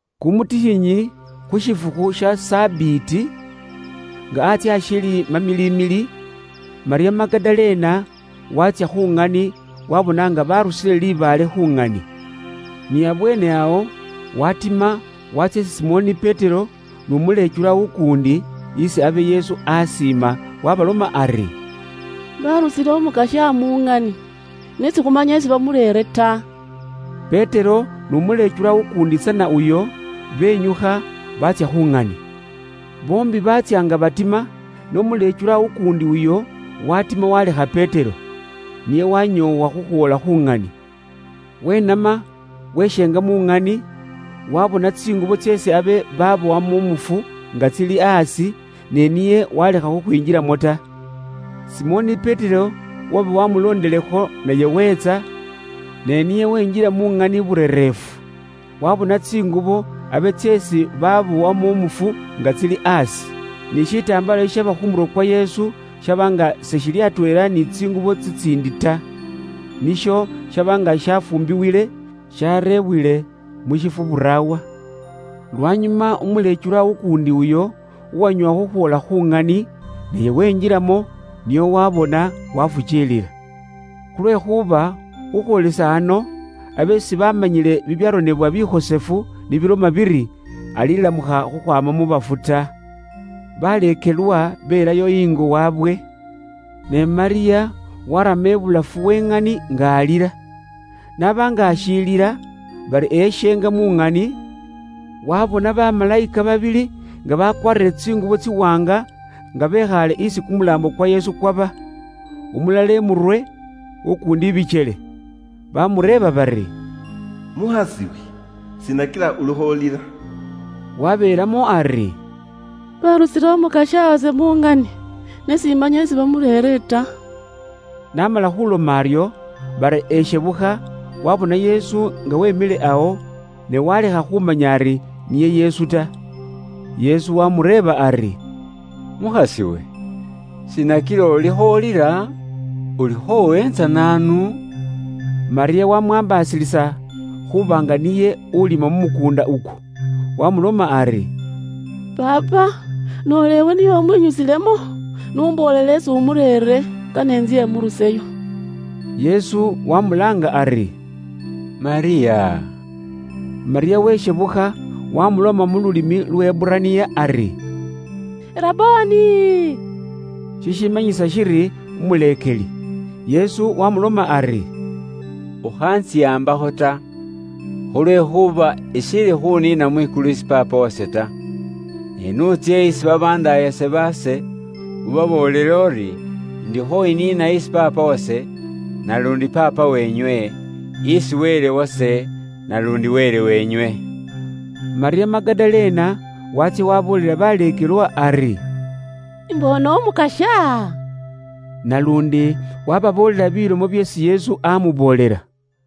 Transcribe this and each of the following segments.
Kumutikhinyi khu shifukhu sha Sabiti, nga antsye ashiili mamiliimili, Malyamu Magadalena waatsya khu ŋani waabona nga baarusile libaale khu ŋani. Ni abweene awo, waatima waatsya isi Simoni Petero n'umuleekelwa ukuundi, isi abe Yesu aasiima, waabaloma ari, “Baarusile Umukasya mu ŋani, ne sikhumanya isi bamureere ta.” Petero n'umuleekelwa ukuundi tsana uyo, benyukha baatsya khu ŋani. Boombi baatsya nga batima, ne umuleekelwa ukuundi uyo waatima waalekha Petero. Niye wanyoowa khukhwoola khu ŋani. Wenama weshenga mu ŋani, waabona tsingubo tseesi abe baabowamo umufu nga tsili aasi, ne niye waalekha khukhwinjilamo ta. Simoni Petero uwaba waamulondilekho naye weetsa, ne niye wenjila mu ŋani burereefu. Waabona tsingubo abe tseesi baabowamo umufu nga tsili aasi. Ne shitambaala shishaba khu murwe kwa Yesu shaba nga seshili atweela ni tsingubo tsitsiindi ta. Nisho shaba nga shafuumbibwile shareebwile mu shifwo buraawa. Lwanyuma umuleekelwa ukuundi uyo, uwanyoowa khukhwoola khu ŋani, naye wenjilamo nio waabona, waafukiilila. Khulwekhuuba khukhwoolisa ano, abe sibamanyile bibyaronebwa bikhosefu ni biloma biri, alilamukha khukhwaama mu bafu ta. Baleekelwa belayo ingo waabwe. Ne Malyamu waarama ibulafu we ŋani nga alila. N'aba nga ashiilila, bari eshenga mu ŋani, waabona bamalayika babili nga bakwaarire tsingubo tsiwaanga, nga bekhaale isi kumulaambo kwa Yesu kwaba. Umulala imurwe, ukuundi ibikyele. Baamureeba bari, “Mukhas'iwe, shiina kila ulikho ulila?” Wabeelamo ari, “Baarusile Umukasya wase mu ŋani, ne simanya isi bamureere ta.” N'amala khuuloma aryo, bari eshebukha, waabona Yesu nga weemikhile awo, ne waalekha khumanya ari niye Yesu ta. Yesu waamureeba ari, “Mukhas'iwe, shiina kila ulikho ulila? Ulikho uweentsa naanu?” Malyamu wamwaambasilisa khuuba nga niye uulima mu mukuunda ukwo. Waamuloma ari, “Paapa, noola iwe niye umwinyusilemo, n'umboolele isi umureere, kane intsye imuruseyo.” Yesu waamulaanga ari, “Malyamu!” Malyamu weshebukha waamuloma mu lulimi Luheburaniya ari, “Rabboni!”, Shishimanyisa shili “Umuleekeli.” Yesu waamuloma ari, “Ukhaantsihambakho ta, khulwekhuuba ishiili khuniina mwikulu isi Paapa wase ta. Ne n'utsye isi babandaayase baase, ubaboolele uri indikho iniina isi Paapa wase, naluundi Paapa wenywe, isi Wele wase, naluundi Wele wenywe.” Malyamu Magadalena waatsya waaboolela baleekelwa ari, “Imboone Umukasya!” Naluundi waababoolela bilomo byeesi Yesu aamuboolela.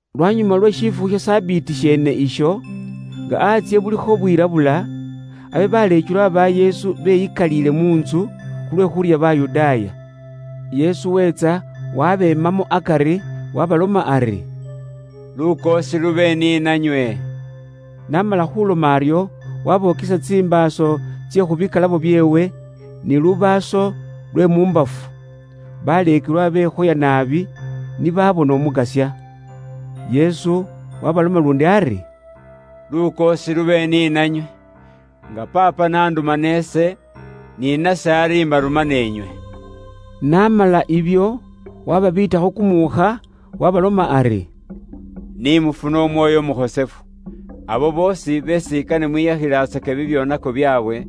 Lwanyuma lwe shifukhu sha Sabiti sheene isho, nga antsye bulikho bwilabula, abe baleekelwa ba Yesu beyikaliile mu ntsu, khulwe khuurya Bayudaaya. Yesu weetsa wabeemamo akari waabaloma ari, “Lukoosi lube ni nanywe.” N'amala khuuloma aryo, waabokesa tsimbaaso tsye khu bikalabo byeewe, ni lubaaso lwe mu mbafu. Baleekelwa bekhoya naabi, ni baabona Umukasya. Yesu waabaloma luundi ari, “Lukoosi lube ni nanywe. Nga Paapa n'andumana ise, ni nase ari imbarumana inywe.” N'amala ibyo, waababiitakho kumuukha, waabaloma ari, “Ni mufune Umwoyo Umukhosefu. Abo boosi beesi kane mwiyakhilatsake bibyoonako byaabwe,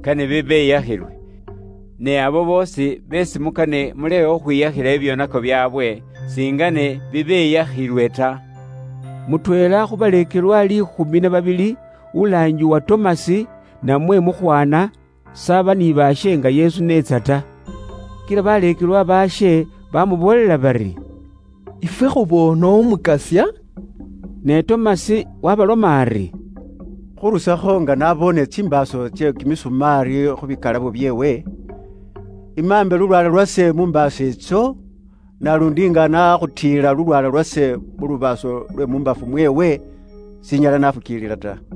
kane bibeyakhilwe; ne abo boosi beesi mukane mulekhe khukhwiyakhila bibyoonako byaabwe, singene bibeyakhilwe ta.” Mutweela khu baleekelwa liikhumi na babili, ulaangibwa Tomasi, namwe Mukhwana, s'aba ni baashe nga Yesu n'etsa ta. Kila baleekelwa baashe bamuboolela bari, “Ifwe khuboone Umukasya.” Ne Tomasi waabaloma ari, “Khurusakho nga naboone tsimbaaso tsye kimisumaali khu bikalabo byeewe; imaambe lulwaala lwase mu mbaaso itso, naluundi nga nakhutiila lulwaala lwase mu lubaaso lwe mu mbafu mweewe, s'inyala naafukiilila ta.”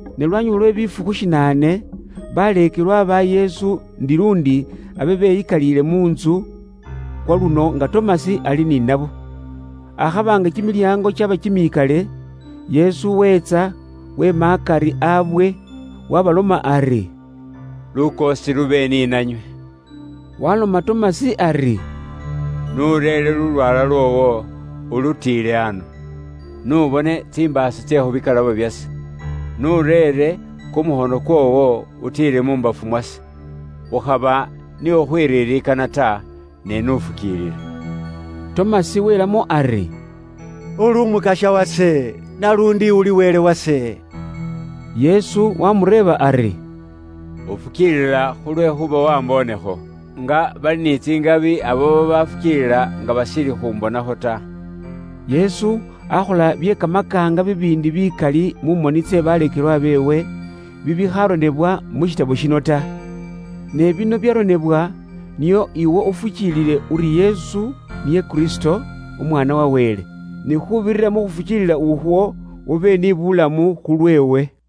Ne lwanyuma lwe bifukhu shinaane, baleekelwa ba Yesu ndi luundi abe beyikaliile mu ntsu, kwaluno nga Tomasi ali ni nabo. Akhaba nga kimilyango kyaba kimikale, Yesu weetsa weema akari aabwe, waabaloma ari, “Lukoosi lube ni nanywe.” Waaloma Tomasi ari, “N'ureere lulwaala lwoowo, ulutiile ano. N'ubone tsimbaaso tsye khu bikalabo byase. N'ureere kumukhono kwoowo utiile mu mbafu mwase. Ukhaba ni khukhwiririkana ta, ne n'ufukiilile.” Tomasi weelamo ari, “Uli Umukasya wase, naluundi uli Wele wase.” Yesu waamureeba ari, “Ufukiilila khulwekhuuba wamboonekho? Nga bali ni tsingabi abo babafukiilila nga bashiili khumbonakho ta.” Yesu akhola bye kamakaanga bibiindi bikali mu moni tsye baleekelwa beewe, bibikhaaronebwa mu burone buno ta. Ne bino byaronebwa nio iwe ufukiilile uri Yesu niye Kristo, Umwaana wa Wele; ni khuubirira mu khufukiilila ukhwo, ube ni bulamu khulweewe.